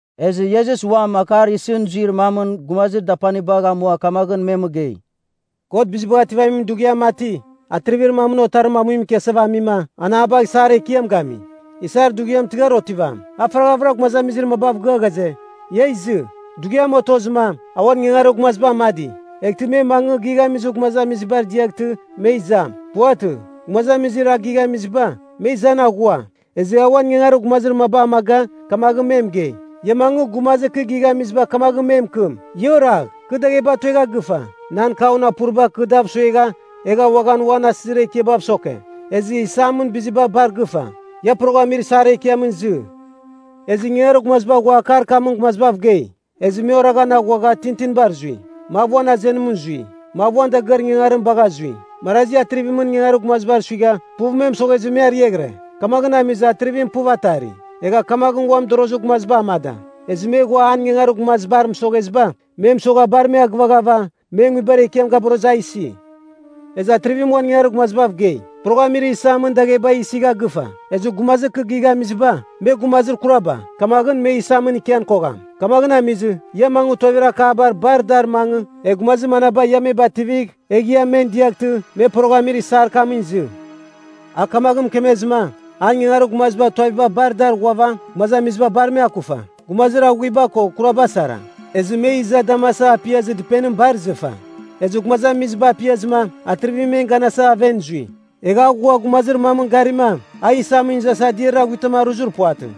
Ezɨ Iesus uam akar isɨn zuir mamɨn gumazir dapanibagh amua kamaghɨn me mɨgei, “God Bizibagh Ativamin Dughiam mati, atrivir mamɨn otarim amuimɨn ikiasava amima, an a bagh isar ekiam gami. Isar dughiam tɨghar otivam, a faraghavɨra gumazamizir mabav gɨa ghaze, ia izɨ. Dughiam otozɨma, a uan ingangarir gumaziba amadi, eghtɨ me mangɨ gighamizir gumazamizibar diaghtɨ, me izam. Puvatɨ, gumazamizir a gighamiziba, me izan aghua. Ezɨ a uan ingangarir gumazir maba amaga, kamaghɨn me mɨgei, ‘Ia mangɨ, gumazir kɨ gighamiziba kamagh me mɨkɨm, “Ia oragh. Kɨ dagheba tuegha gɨfa, nan kaun apuriba kɨ dav suegha, egha uaghan uan asɨzir ekiabav soke. Ezɨ isamɨn biziba bar gɨfa. Ia poroghamir isar ekiamɨn izɨ.” ’ “Ezɨ ingangarir gumaziba ghua akar kamɨn gumazibav gei. Ezɨ me oraghan aghuagha tintinibar zui. Mav uan azenimɨn zui, mav uan dagɨar ingangarim bagha zui. Marazi atrivimɨn ingangarir gumazibar suigha, puv me mɨsoghezɨ me ariaghɨre. “Kamaghɨn amizɨ, atrivim puv atari, egha kamaghɨn uan mɨdorozir gumaziba amada. Ezɨ me ghua an ingangarir gumazibar mɨsogheziba, me mɨsogha bar me agɨvaghava, men nguibar ekiam gaborozɨ a isi. “Ezɨ atrivim uan ingangarir gumazibav gei, ‘Poroghamir isamɨn dagheba isigha gɨfa. Ezɨ gumazir kɨ gighamiziba, me gumazir kuraba, kamaghɨn me isamɨn ikian kogham. Kamaghɨn amizɨ, ia mangɨ tuavir akaba bar dar mangɨ, egh gumazir manaba ia me bativigh, egh ia men diaghtɨ, me poroghamir isar kamɨn izɨ.’ A kamaghɨn mɨkemezɨma, an ingangarir gumaziba tuaviba bar dar ghuava gumazamiziba bar me akufa, gumazir aghuiba ko kuraba sara. Ezɨ me iza damasava apiazɨ dɨpenim bar izɨfa. “Ezɨ gumazamiziba apiazɨma, atrivim men ganasa aven zui. Egha a ghua gumazir mamɨn garima, a isamɨn izasa adiariar aghuitam aruzir puvatɨ.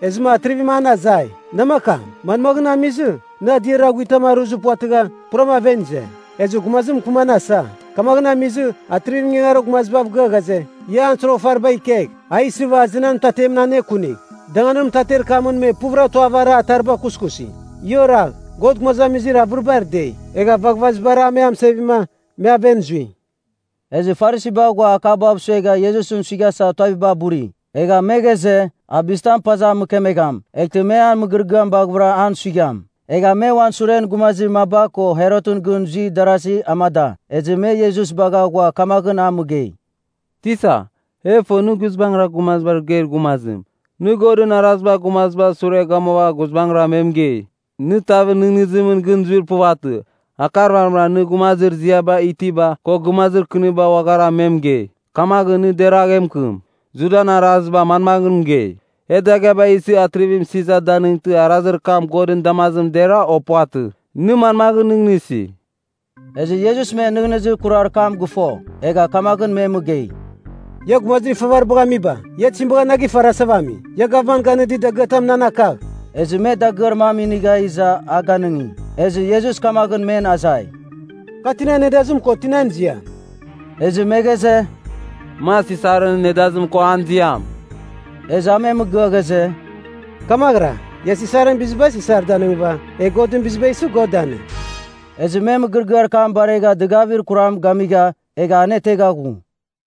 Ezɨma atrivim an azai, ‘Namakam, manmaghɨn amizɨ, nɨ adiarir aghuitam aruzir puvatɨgha, puram aven ize?’ Ezɨ gumazim mɨkɨman asa. Kamaghɨn amizɨ, atrivim ingangarir gumazibav gɨa ghaze, ‘Ia an soroghafariba ikegh, a isɨva azenan mɨtatemɨn anekunigh. Danganir mɨtater kamɨn me puvɨra tuavara atariba kuskusi.’ “Ia oragh. God gumazamizir avɨribar dei, egha vaghvazibara a me amɨsevima, me aven zui.” Ezɨ Farisiba ghua akabav suegha Iesusɨn suighasa tuaviba buri. Egha me ghaze, a bizitam a paza mɨkemegham, eghtɨ me an mɨgɨrɨgɨam baghavɨra an suigham. Egha me uan suren gumazir maba ko Herotɨn gɨn zuir darazi amada, ezɨ me Iesus bagha ghua kamaghɨn a mɨgei, “Tisa, e fo nɨ guizbangɨra bizibav geir gumazim. Nɨ Godɨn Arazibar gumazibar sure gamuava guizbangɨra me mɨgei. Nɨ tavɨn nɨghnɨzimɨn gɨn zuir puvatɨ. Akar vamɨra nɨ gumazir ziaba itiba, ko gumazir kɨniba uaghara, me mɨgei. Kamaghɨn, nɨ deragh e mɨkɨm. Judan araziba manmaghɨn mɨgei? E dagɨaba isɨva Atrivim Sisar danɨngtɨma, arazir kam Godɨn damazimɨn dera, o puvatɨ? Nɨ manmaghɨn nɨghnɨsi?” Ezɨ Iesus men nɨghnɨzir kurar kam gɨfo, egha kamaghɨn me mɨgei, “Ia gumazir ifavaribagh amiba, ia tizim bagha na gifarasava ami? Ia gavman ganɨdir dagɨatam nan akagh.” Ezɨ me dagɨar mam inigha iza a ganɨngi. Ezɨ Iesus kamaghɨn men azai, “Kar tinan nedazim ko tinan ziam?” Ezɨ me ghaze, “Mar Sisarɨn nedazim ko an ziam.” Ezɨ a me mɨgɨa ghaze, “Kamaghɨra, ia Sisarɨn biziba Sisar danɨngɨva, egh Godɨn biziba isɨ, God danɨng.” Ezɨ me mɨgɨrɨgɨar kam baregha dɨgavir kuram gamigha, egha anetegha ghue.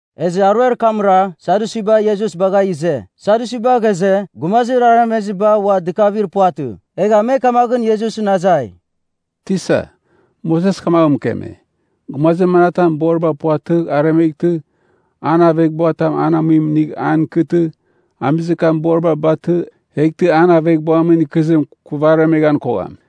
Ezɨ aruer kamra, Sadyusiba Iesus bagha ize. Sadyusiba ghaze, gumazir aremeziba ua dɨkavir puvatɨ. Egha me kamaghɨn Iesusɨn azai, “Tisa, Moses kamaghɨn mɨkeme, Gumazir manatam boriba puvatɨgh aremeghtɨ, an aveghbuatam an amuim inigh an ikɨtɨ, amizir kam boriba batɨ, eghtɨ an aveghbuamɨn ikɨzim kuvaremeghan kogham.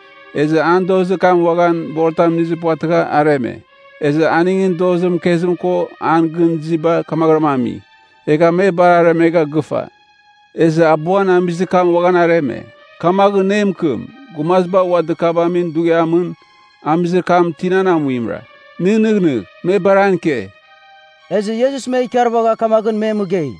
Ezɨ an dozir kam uaghan boritam inizir puvatɨgha areme. Ezɨ aningɨn dozir mɨkezim ko an gɨn iziba kamaghɨram ami. Egha me bar aremegha gɨfa, ezɨ abuan amizir kam uaghan areme. Kamaghɨn nɨ e mɨkɨm, gumaziba ua dɨkavamin dughiamɨn, amizir kam tinan amuimra? Nɨ nɨghnɨgh, me bar an ike!” Ezɨ Iesus me ikarvagha kamaghɨn me mɨgei,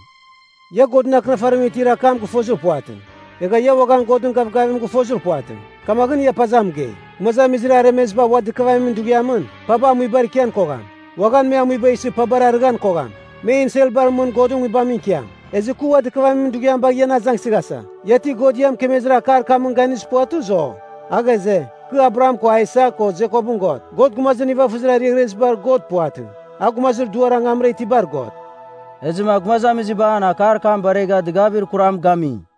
“Ia Godɨn Akɨnafarimɨn itir akam gɨfozir puvatɨ, egha ia uaghan Godɨn gavgavim gɨfozir puvatɨ. Kamaghɨn, ia paza mɨgei. Gumazamizir aremeziba ua dɨkavamin dughiamɨn, paba amuibar ikian kogham, uaghan me amuiba isɨ pabar arɨghan kogham. Me enselbar mɨn Godɨn Nguibamɨn ikiam. “Ezɨ kɨ ua dɨkavamin dughiam bagh ian azangasa. Ia ti God ia mɨkemezir akar kamɨn ganizir puvatɨ, o? A ghaze, ‘Kɨ Abraham ko Aisak ko Jekopɨn God.’ God gumazir nivafɨzir ariaghɨribar God puvatɨ, a gumazir duar angamra itibar God.” Ezɨma gumazamiziba an akar kam baregha dɨgavir kuram gami.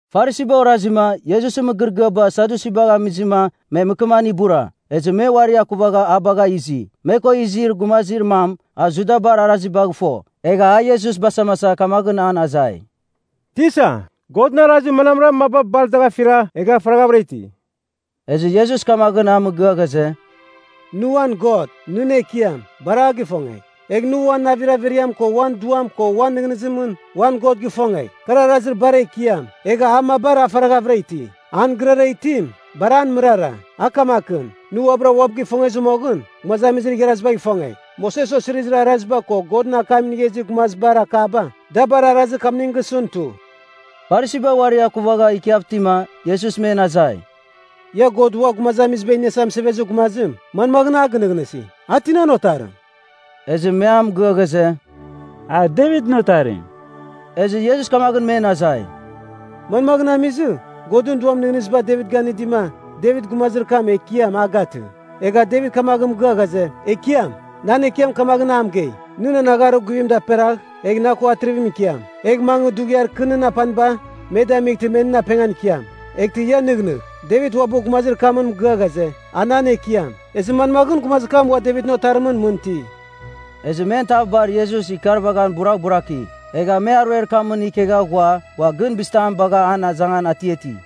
Farisiba orazima, Iesusɨn mɨgɨrɨgɨaba Sadyusibagh amizɨma, me mɨkɨman ibura. Ezɨ me uari akuvagha a bagha izi. Me ko izir gumazir mam, a Judabar arazibagh fo. Egha a Iesus basamasa kamaghɨn an azai, “Tisa, Godɨn arazir manamra maba bar dagh afira egha faraghavɨra iti?” Ezɨ Iesus kamaghɨn a mɨgɨa ghaze, “Nɨ uan God, nɨn Ekiam, bar a gifongegh, egh nɨ uan navir averiam ko uan duam ko uan nɨghnɨzimɨn, uan God gifongegh. Kar arazir bar ekiam, egha a mabar a faraghavɨra iti. An gɨrara itim, bar an mɨrara. A kamakɨn: nɨ uabɨra uabɨ gifongezɨ moghɨn, gumazamizir igharazibagh ifongegh. Moses Osirizir Araziba ko Godɨn akam inigha izir gumazibar akaba, da bar arazir kamning gisɨn tu.” Farisiba uari akuvagha ikiav itima, Iesus men azai, “Ia God Ua Gumazamiziba Iniasa Mɨsevezir Gumazim, manmaghɨn a gɨnɨghnɨsi? A tinan otarim?” Ezɨ me an mɨgɨa ghaze, “A Devitɨn Otarim.” Ezɨ Iesus kamaghɨn men azai, “Manmaghɨn amizɨ, Godɨn Duam nɨghnɨziba Devit ganɨdima, Devit gumazir kam ‘Ekiam’ a gatɨ, egha Devit kamaghɨn mɨgɨa ghaze, ‘Ekiam, nan Ekiam kamaghɨn a mɨgei, “Nɨ nan agharir guvim daperagh, egh na ko atrivimɨn ikiam. Egh mangɨ dughiar kɨ nɨn apaniba, me damightɨ me nɨn apengan ikiam.” ’ Eghtɨ ia nɨghnɨgh, Devit uabɨ gumazir kamɨn mɨgɨa ghaze, a nan Ekiam. Ezɨ manmaghɨn, gumazir kam ua Devitɨn Otarimɨn mɨn iti?” Ezɨ men tav bar Iesus ikarvaghan buraghburaki. Egha me aruer kamɨn ikegha ghua ua gɨn bizitam bagha an azangan atiati.